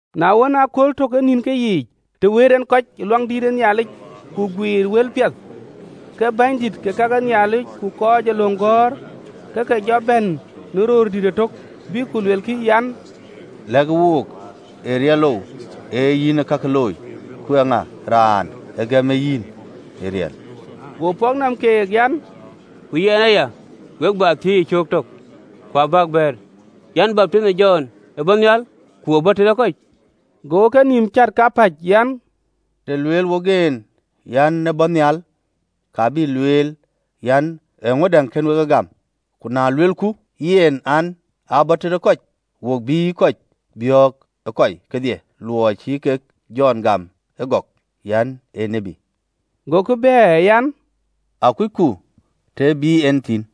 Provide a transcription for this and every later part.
Na ɣɔn, ëkööl tök ee nïnkë yiic, të wëët en kɔc ë Luaŋdïtic, ku guiir wëlpiɛth, ke bänydït ke ka ke Nhialic ku kɔc ee löŋ gɔ̈ɔ̈r, ke ke jɔ bɛ̈n në röördït ëtök, bïk ku luelkï an, “Lɛ̈kë wook, ee riɛlou ee yïn ee kakë looi? Ku eeŋa ee raan ë gëm yïn ee riɛlë?” Go pɔ̈k nɔm keek an, “Ku yɛn aya, we bä thiëc cöök tök, ku abäk bɛ̈ɛ̈r: an Baptinh ë Jɔn, ë bɔ̈ nhial, ku ë bɔ̈ tëde kɔc?” Gokï kenïïm cät kapäc an, “Të lueel wok en an, ‘Aa bɔ̈ nhial,’ ka bï lueel an, ‘Eeŋödäŋ kɛ̈n wek egam?’ Ku na luelku yen an, ‘Aa bɔ̈ tëde kɔc,’ wo bïï kɔc biɔ̈ɔ̈k ë kɔi kedhie: luɔi cï kek Jɔn gam ëgɔk an, ee tiët.” Gokï bɛ̈ɛ̈r an, “Akucku të ë bï en thïn.”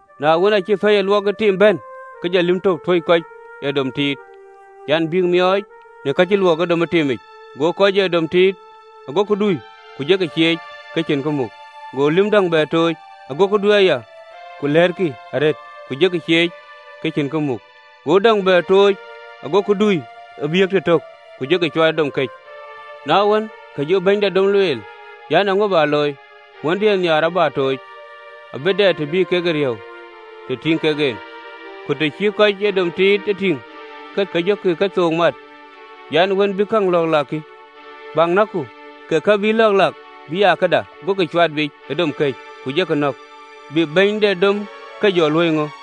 Na wën, aacï pɛɛi ë luɔk ë tiim bɛ̈n, ke jɔ lïm tök tuöc kɔc ee dom tiit an, bïk miɔɔc në ka cï luɔk ë dom ë tiim yiic: go kɔc ee dom tiit gokï dui, ku jɔkï cieec, ke cïn kë muk. Go lïm däŋ bɛ tooc: gokï dui aya, ku lɛ̈ɛ̈tkï arëët, ku jɔkï cieec, ke cïn kë muk. Go däŋ bɛ tooc, gokï dui abïk yiëk tëtök, ku jɔkï cuat ë dom këc. Na wën, ke jɔ bɛ̈ny de dom lueel an, ‘Eeŋö bä looi? Wëndiën nhiaar abä tooc: abï dɛ të bï kek e riëëu të tïŋ kek en!’ Ku të cï kɔc ee dom tiit e tïŋ, ke ke jɔ kethook mat an, ‘Wën bï käŋ lɔ̈ɔ̈k lak kï. Bäk näkku, ke ke buk lɔ̈ɔ̈k lak bï aa këda!’ Gokï cuat biic ë dom këc, ku jɔkï nɔ̈k. Bï bɛ̈ny de dom ke jɔ luöi ŋö?”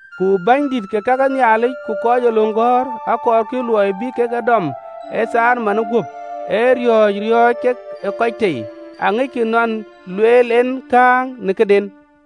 Ku bänydït ke ka ke Nhialic ku kɔc ee löŋ gɔ̈ɔ̈r akɔɔrkï luɔi bï kek e dɔm ë thaar manë guöp, ee riɔ̈ɔ̈c riɔ̈ɔ̈c kek ë kɔc tei: aŋickï nɔn ë lueel en kääŋë në këden.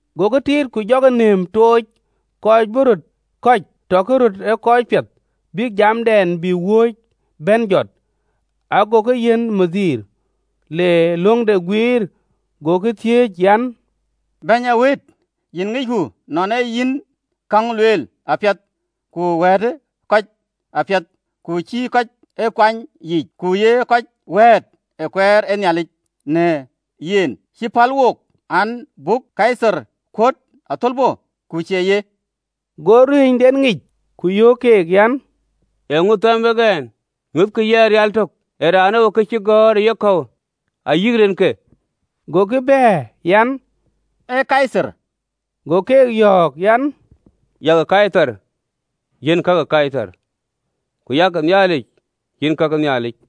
Gokï tiit, ku jɔkï nëëm tooc, kɔc bï röt kɔ̈c tɔkï röt ë kɔc piɛth, bïk jamdɛn bï wööc bɛ̈n jɔt, agokï yiɛ̈n bɛ̈ny, le löŋde guiir. Gokï thiëëc an, “Bɛ̈ny ee wëët, yïn ŋicku nɔn ee yïn käŋ lueel apiɛth ku wɛ̈ɛ̈të kɔc apiɛth, ku cïï kɔc ee kuany yiic, ku ye kɔc wɛ̈ɛ̈t ë kueer ë Nhialic në yic. Cï pal wook an, buk Kaithar kuöt athölbö, ku cie ye?” Go ruëënyden ŋic, ku yöök keek an, “Eeŋö thɛm wek ɛn? Nyuöthkï yɛn rial tök. Ee raanou cï gɔ̈ɔ̈r ë yekɔ̈u, ayï rinke?” Gokï bɛ̈ɛ̈r an, “Ee Kaithar.” Go keek yɔ̈ɔ̈k an, “Yak Kaithar yiɛ̈n ka ke Kaithar, ku yak Nhialic yiɛ̈n ka ke Nhialic.”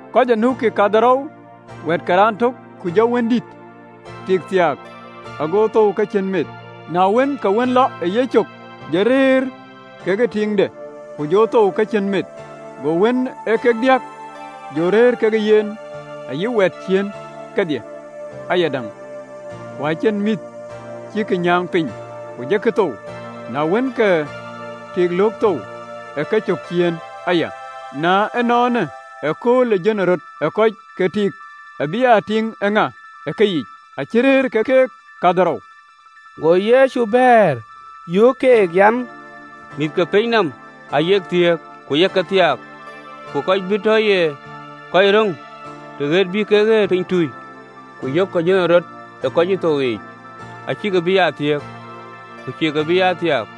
Ku aa de raan ë de nɔm wɛ̈ɛ̈t kadhorou: ku jɔ wëndït tik thiaak, ago thou ke cïn meth. Na wën, ke wën lɔ ë yecök jɔ rëër kekë tiiŋde, ku jɔ thou ke cïn meth. Go wën ee kek diäk jɔ rëër kekë yen, ayï wɛ̈ɛ̈t ciëën kedhie ayadäŋ: ku acïn mïth cïk nyääŋ piny, ku jɔkï thou. Na wën, ke tik löök thou ë ke cök ciëën aya. Na ënɔɔnë, ëkööl ë jönërɔt ë kɔc, ke tiiŋë bï aa tiiŋ ë ŋa ë keyiic? Acï rëër ke keek kadhorou. Go Yecu bɛ̈ɛ̈r, yöök keek an, “Mïth ke pinyë nɔm ayek thiëëk, ku ye ke thiaak, ku kɔc bï tɔ ye kɔc röŋ në ɣet bï kek ɣet pinytui, ku yökkï jönërɔt ë kɔc cï thou yiic, acïkï bï aa thiëëk, ku cïï ke bï aa thiaak,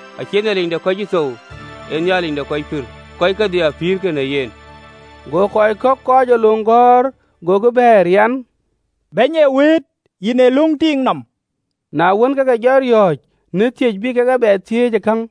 Acie Nhialic de kɔc cï thou, ee Nhialic de kɔc pïïr: kɔc kedhie apïïrkï në yen.” Go kɔc kɔ̈k ë kɔc ee löŋ gɔ̈ɔ̈r gokï bɛ̈ɛ̈r an, “Bɛ̈ny ee wëët, yïn ë löŋ tiiŋ nɔm!” Na wën, ke ke jɔ riɔ̈ɔ̈c në thiëc bï kek e bɛ thiëc käŋ.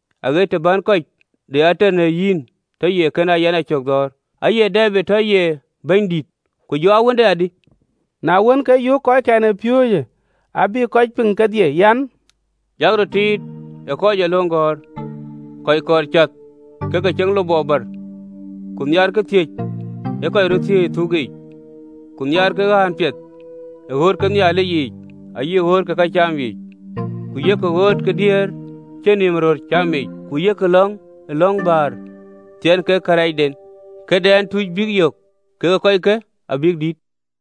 Aɣet të bän kɔc de ater në yïn tɔ ye kën ee yïn yïcök dhɔ̈ɔ̈r.’ Aye Debid tɔ ye ‘Bɛ̈nydït’, ku jɔ aa wënde adï?” Na wën, ke yöök kɔckɛn ë piööcë abï kɔc piŋ kedhie an, “Yak röt tiit ë kɔc ee löŋ gɔ̈ɔ̈r, kɔc kɔɔr cath ke ke ceŋ lupɔɔ bär, ku nhiaarkï thiëc ee kɔc röt thiëc ë thuk yiic, ku nhiaarkï ɣään piɛth ë ɣööt ke Nhialic yiic ayï ɣööt ke këcam yiic, ku yek ɣööt ke diëër cïn nïïm röör cam yiic, ku yek lɔ̈ŋ ë lɔ̈ŋ bäär thiɛɛn kek kërɛɛcden: këdɛn tuc bïk yök kek ee kɔckë abï dït!”